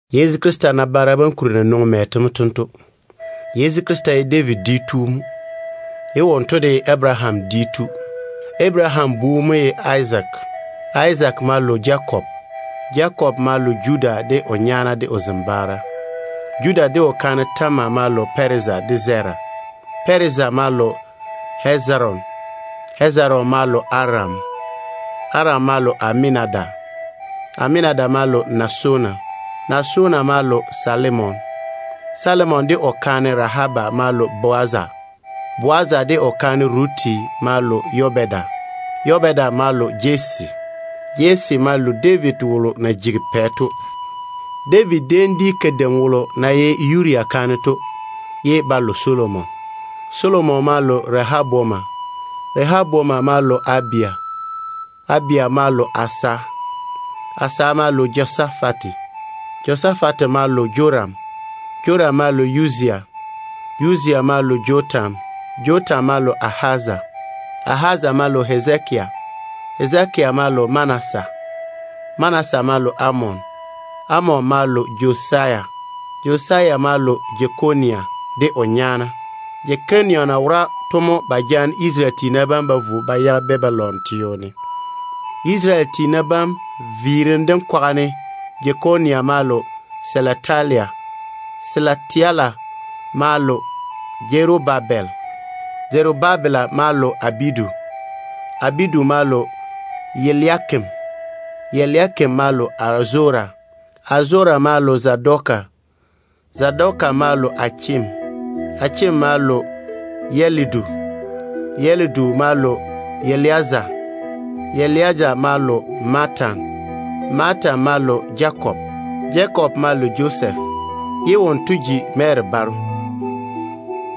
Yezu Krista nabaara bam kuri na nwoŋi mɛ to mo tento: Yezu Krista ye David dwi tu mo, ye wonto de ye Abaraham dwi tu. Abaraham bu mo ye Izaak. Izaak ma lo Jakob. Jakob ma lo Judah de o nyaana de o zembaara. Judah de o kaane Tamara ma lo Pɛreza de Zera. Pɛreza ma lo Hezeron. Hezeron ma lo Aram. Aram ma lo Aminadabi. Aminadabi ma lo Naason. Naason ma lo Salimon. Salimon de o kaane Rahaba ma lo Bowaza. Bowaza de o kaane Ruf ma lo Obeda. Obeda ma lo Jesse. Jesse ma lo David wolo na jigi pɛ to. David déem di kadeim wolo ya na ye Yuria kaane to mo, ye ba lo Solomon. Solomon ma lo Rehoboam. Rehoboam ma lo Abija. Abija ma lo Asaf. Asaf ma lo Jehosafate. Jehosafate ma lo Joram. Joram ma lo Yuzia. Yuzia ma lo Jotam. Jotam ma lo Ahaz. Ahaz ma lo Hezekia. Hezekia ma lo Manasɛ. Manasɛ ma lo Amon. Amon ma lo Josia. Josia ma lo Jekonia de o nyaana. Jekonia na wora to mo ba jaane Isarele tiina bam ba vo ba yage Babilon teo ne. Isarele tiina bam viirim dem kwaga ne, Jekonia ma lo Selateli. Selateli ma lo Zerubabel. Zerubabel ma lo Abidu. Abidu ma lo Eliakim. Eliakim ma lo Azora. Azora ma lo Zadoki. Zadoki ma lo Achim. Achim ma lo Elidu. Elidu ma lo Eleaza. Eleaza ma lo Matan. Matan ma lo Jakob. Jakob ma lo Josef, ye wonto ji Mary baro.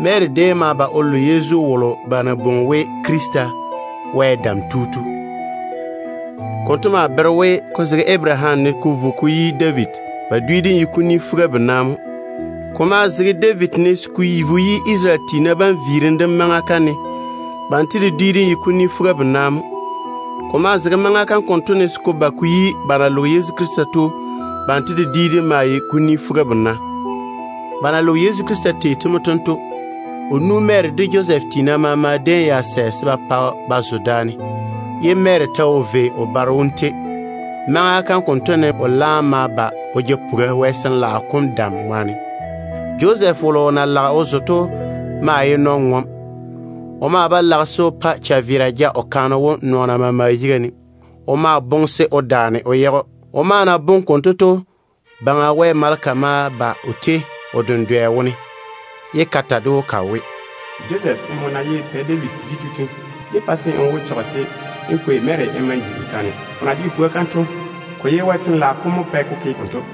Mary déem ma lo Yezu wolo ba na bwoŋi we Wɛ Dam Tu Krista to. Konto maa bere we, ko zege Abaraham ne mo ko vo ko yi David, ba dwi dem ye kuni fuga-bena mo. Ko maa zege David ne se ko vo ko yi maŋa kalo ba na kale Isarele tiina bam ba ja ba vo Babilon to, banto de dwi dem ye kuni fuga-bena mo. Ko maa zege maŋa kam konto ne se ko ba ko yi ba na loge Yezu Krista to, banto de dwi dem maa ye kuni fuga-bena. Ba na loge Yezu Krista tei to mo tento. O nu Mary de Josɛf tiina maama déem ya sɛ se ba pa ba zo daane, ye Mary ta wo vei o baro wom tei. Maŋa kam konto ne o laam ma ba o ja puga Wɛ Sin-laao kom dam ŋwaane. Josɛf wolo o na lage o zo to maa ye nɔn-ŋom. O maa ba lage se o pa chaveera ja o kaane wom nɔɔna maama yiga ne. O ma boŋe se o daane o yage‑o. O na maa boŋe konto to, Baŋa Wɛ maleka ma ba o tei o dendwɛ wone, ye ka ta ded‑o ka we, “Josef, nmo na ye Pɛ David dwi tu to, yé pa se n wo chɔge se n kwei Mary n ma‑n ji n kaane. O na jege puga kam to, ko ye Wɛ Sin-laao kom mo pɛ ko ke konto.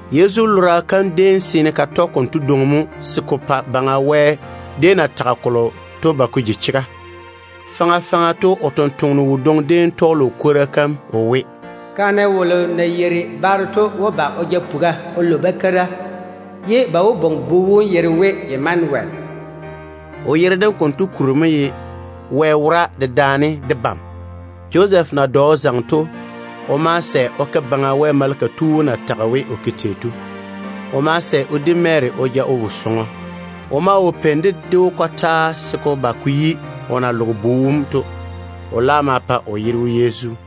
Yezu lora kam déem seene ka tɔge konto dwoŋi mo se ko pa Baŋa Wɛ déem na tage kolo to ba ko ji chega. Faŋa faŋa to o sampwora kadwoŋi déem tɔɔle o kwora kam we: “Busankan-pwola wó ba o ja puga o lo bakeira. Ba maa wó bwoŋi bu wom yere we Imanuwel.” O yere dem konto kuri mo ye ‘Wɛ wora dedaane debam’. Josɛf na dɔ o zaŋe to, o ma sɛ o ke Baŋa Wɛ maleka tu wom na tage we o ke tei to. O ma sɛ o di Mary o ja vo sɔŋɔ. O maa wo peini ded‑o fase se ko ba ko yi o na loge bu wom to. O laam ma pa o yere we, Yezu.